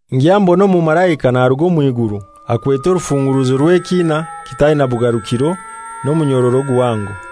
Ngya mbona omumalaika naruga omw'iguru akwete orufunguruzo rw'ekina kitaina bugarukiro n'omunyororo guhango.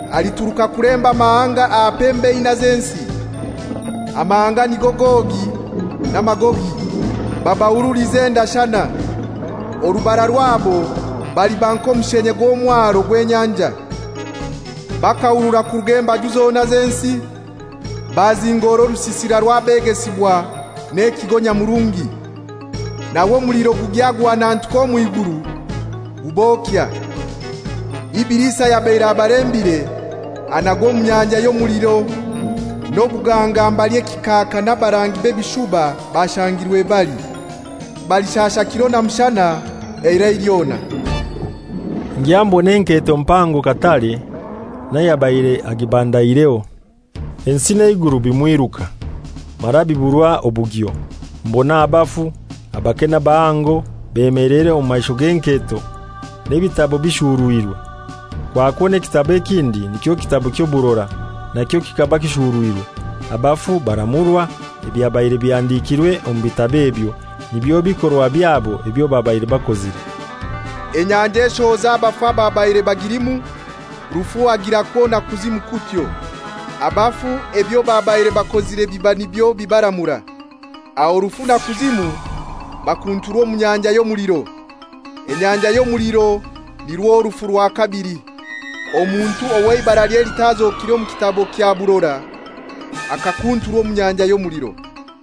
Alituruka kulemba amahanga aha pembe inai z'ensi, amahanga nigo Gogi na Magogi, babahurulize endashana. Orubara rwabo baliba nk'omushenye gw'omwaro gw'enyanja. Bakahurura kuruga embaju zona z'ensi, bazingora orusisira rw'abegesibwa n'ekigo nyamurungi. Nawe omuliro gugya guhanantuka omw'iguru gubokya. Ibilisi ayabaire abalembire anagwa omu nyanja y'omuliro n'obuganga mbali ekikaaka n'abarangi w'ebishuba bashangirwe bali, balishasha kiro na mushana eirai lyona. Ngya mbona enketo mpango katare n'ayabaire agibandaireho. Ensi n'eiguru bimwiruka, mara biburwa obugyo. Mbona abafu, abake n'abahango, bemeleire omu maisho g'enketo, n'ebitabo bishurwire. Kwakwo n'ekitabo ekindi, nikyo kitabo ky'oburora, nakyo kikaba kishurwirwe. Abafu baramurwa ebyabaire bihandikirwe omu bitabo ebyo, nibyo bikorwa byabo ebyo babaire bakozire. Enyanja eshohoza abafu ababaire bagilimu, Rufu agirakwo na Kuzimu kutyo. Abafu ebyo babaire bakozire biba nibyo bibaramura. Aho Rufu na Kuzimu bakunturwa omu nyanja y'omuliro. Enyanja y'omuliro nirwo rufu rwa kabili. Omuntu ow'eibaralye litazokire mu kitabo kya burora akakunturwa omu nyanja y'omuliro.